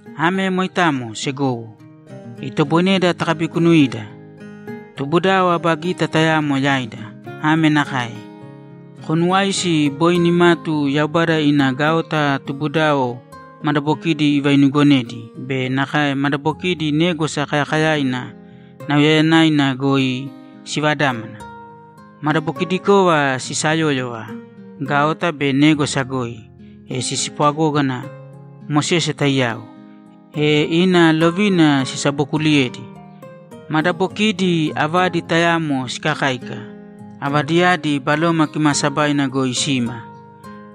Ame moitamo, segowo, itoboineda takabikunuida. Tubudao aba gita tayamo yaida. Ame nakae: Konuwāisi boi nimatu Yaubada ina gaota tubudao madabokidi ivainugonedi be nakae madabokidi Négwasa Kayakayaina nauyayanaina goi sivadámana. Madabokidikova sisayóyova gaota be négwasa goi, e sispwagógana Mosese taiyao, e ina lovina sisabokuliyedi. Madabokiidi avadi tayamo sikakáika, avadiyadi Baloma Kimaasabaina goi sima.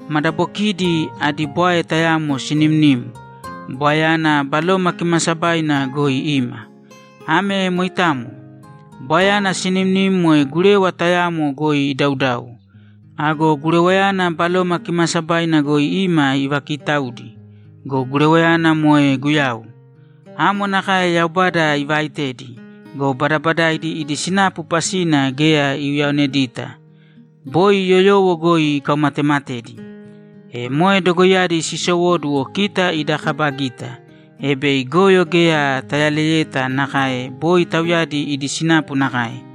Madabokiidi adi bwae tayamo sinimnim; bwaeyana Baloma Kimaasabaina goi ima. Ame moitamo. Bwaeyana sinimnim moe gurewa tayamo goi idaudau. Ago gurewayana Baloma Kimaasabaina goi ima ivakitaudi go, gurewayana moe Guyau. Amo nakae Yaubada ivaaitedi go, badabadaidi idi sinapu pasina geya iuyaonedita. Boi yoyowo goi ikaumatematedi. E moe dogoiyadi sisowóduwo kita ida kaba gita, e bei goyo geya tayaleyeta nakae boi tauyadi idi sinapu nakae.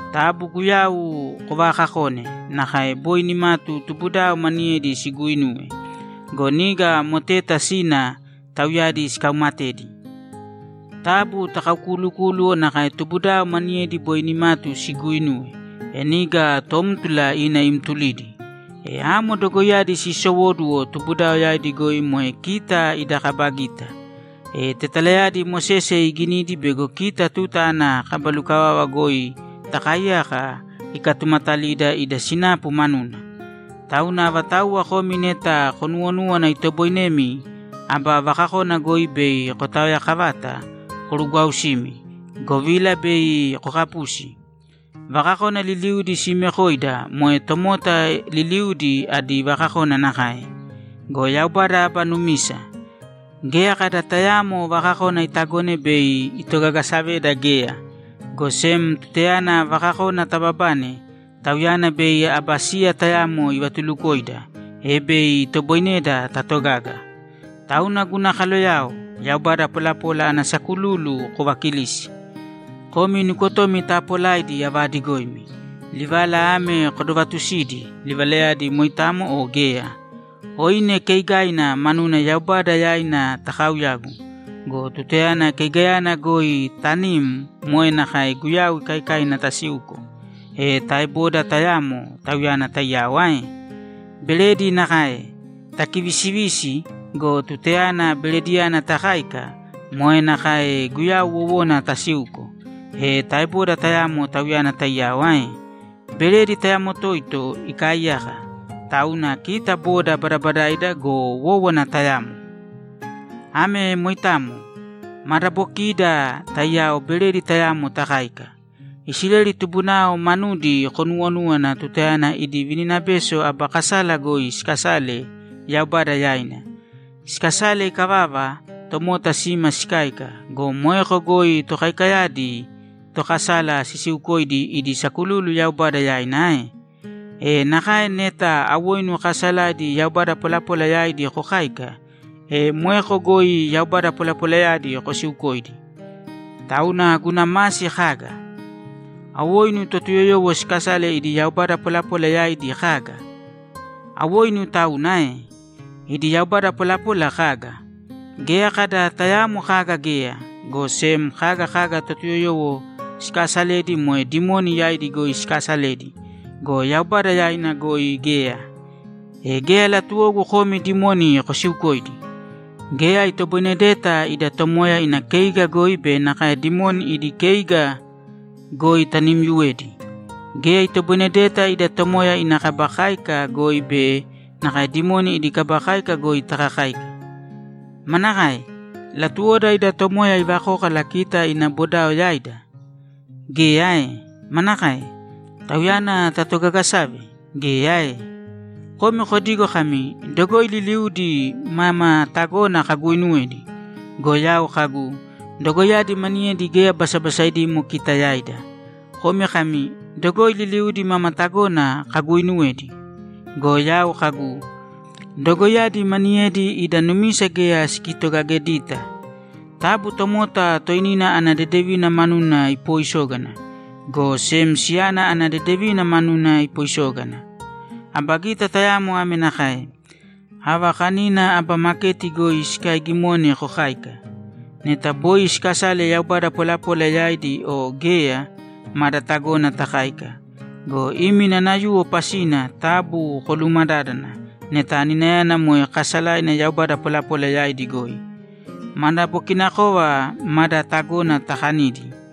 Taabu Guyau kovaakakōne nakae boi nimatu tubudao maniyedi siguuinuwe go, niga moteta sina tauyadi sikaumatedi. Taabu takaukuulukūluwo nakae tubudao maniyedi boi nimatu siguuinuwe, e niga tómtula ina imtulidi. E amo dogoiyadi siisowóduwo tubudao yaidi goi moe kita ida kaba gita. E tetalayadi Mosese iginidi bego kita tuta ana kaba lukavava goi takaaiyaka ikatumatalida ida sinapu manuna. Tauna avatauwa komi neta konuwonúwana itoboinemi aba vakakona goi bei kotaoyakavata, korugwausīmi, govila bei kokapusi. Vakakona liliudi siimekoida moe tomota liliudi adi vakakona nakae. Go Yaubada aba numisa. Geya kada tayaamo vakakona itagone bei itogagasaveda geya, go sem tutayana vakakona tababane, Tauyana bei aba siya tayamo ivatulukoida, e bei itoboineda tatogaga. Tauna guna kaloyao, yaubada polapola ana sakululu kovakilīsi. Komi nukotomi taapolaidi avaadigoimi, livala ame kodovatusīdi, livalayadi moitamo o geya. Oine keigaina manuna Yaubada yaina takauyagu go, tutayana keigayana goi tanim moe nakae Guyau ikaikaina tasiuko, e taeboda tayamo Tauyana taiyao ae? Beredi nakae. Takivisivisi go, tutayana berediyana takáika, moe nakae Guyau wowona tasiuko, e taeboda tayamo Tauyana taiyao ae? Beredi tayamo toito ikaaiyaka, tauna kita boda badabadaida go, wówana tayamo. Ame moitamo. Madabokiida taiyao beredi tayamo takáika. Isileli tubunao manudi konuwonūwana tutayana idi vininabeso aba kasala goi sikasale Yaubada yaina. Sikasale ikavava, tomota sima sikáika go, moeko goi tokaikayadi tokasala sisiukoidi idi sakululu Yaubada yaina ae? E nakae neta awoinu kaasalaidi yaubada polapola yaidi kokáika, e moeko goi yaubada polapolayadi kosiukoidi. Tauna guna masi kaga? Awoinu Totuyoyowo sikasale idi yaubada polapola yaidi kaga? Awoinu tauna ae? Idi yaubada polapola kaga? Geya kada tayaamo kaga geya, go sem kaga kaga Totuyoyowo sikaasaledi moe dimoni yaidi goi sikaasaledi go, Yaubada yaina goi geya. E geya latuwogu komi dimoni kosiukoidi. Geya itoboinedeta ida Tomoya ina keiga goi be nakae dimoni idi keiga goi tanimyuwedi. Geya itoboinedeta ida Tomoya ina kaba káika goi be nakae dimoni idi kaba káika goi takakáika. Manakae? Latuwoda ida Tomoya ivakókala kita ina boda yaida? Geya ae? Manakae? Tauyana tatogagesave? Geya ae? Komi kodigo kami, ‘Dogoi liliudi mama tagona kaguuinuwedi.’ Go yau kagu, ‘Dogoiyadi maniyedi geya basabasaidimo kita yaida.’ Komi kami, ‘Dogoi liliudi mama tagona kaguuinuwedi.’ Go yau kagu, ‘Dogoiyadi maniyedi ida numisa geya sikitogagedita.’ Taabu tomota toinina ana dedevina manuna ipooisōgana, go sem siyana ana dedevina manuna ipoisōgana. Aba gita tayamo ame nakae: Ava kanina aba maketi goi sikaiigimone kokāika. Neta boi sikasale yaubada polapola yaidi o geya, mada tagona takáika go, imi nanayuwo pasina taabu koluumadādana neta aninayana moe kaasalaina yaubada polapola yaidi goi. Madabokinakova mada tagona takanidi.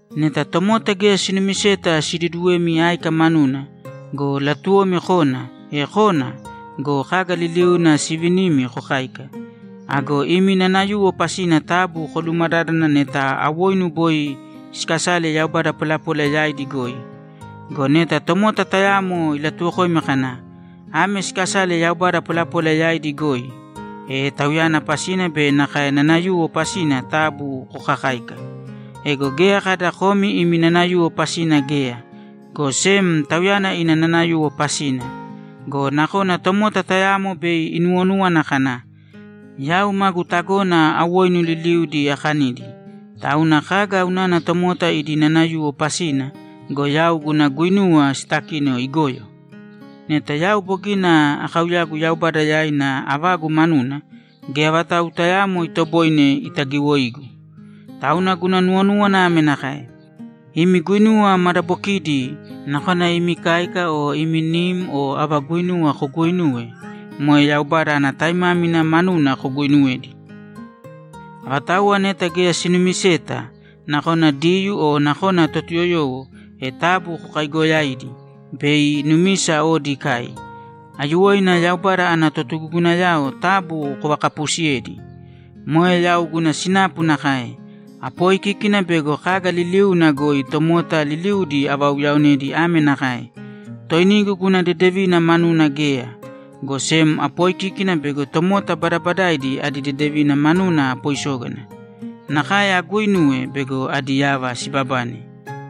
Neta tomota geya sinumiseta siduduwemi áika manuna go, latuwomi kona, e kōna go, kaga liliuna sivinimi kokāika. Ago imi nanayuwo pasina taabu koluumadādana neta awoinu boi siikasale yaubada polapola yaidi goi. Go neta tomota tayamo ilatuwokoimi kana, ‘Ame sikasale yaubada polapola yaidi goi’, e tauyana pasina be nakae nanayuwo pasina taabu kokakāika. Ego geya kada komi imi nanayuwo pasina geya, go sem tauyana ina nanayuwo pasina. Go nakona tomota tayamo bei inuwonúwana kana, ‘Yau magu tagona awoinu liliudi akanidi, tauna kaga unana tomota idi nanayuwo pasina go, yau guna guinuwa sitakino igoyo? Neta yau bogina akauyagu Yaubada yaina avagu manuna, geya vatau tayaamo itoboine itagiwoigu.’ Tauna guna nuwonúwana ame nakae: Imi guinuwa madabokidi, nakona imi káika o imi nim o ava guinuwa koguuinuwe, moe Yaubada ana taimámina manuna koguuinuwēdi. Avatauwa neta geya sinumiseta, nakona Diyuu o nakona Totuyoyowo, e taabu kokaaigoyāidi bei numisa odi ikai. Aiyuwoina Yaubada ana totugugunayao taabu kovakapuusiyēdi. Moe yau guna sinapu nakae. Apooikíkina bego kaga liliuna goi tomota liliudi avauyaonedi ame nakae: Toinigu guna dedevina manuna geya, go sem apooikíkina bego tomota badabadaidi adi dedevina manuna apoisógana. Nakae aguuinuwe bego adi yava sibabane.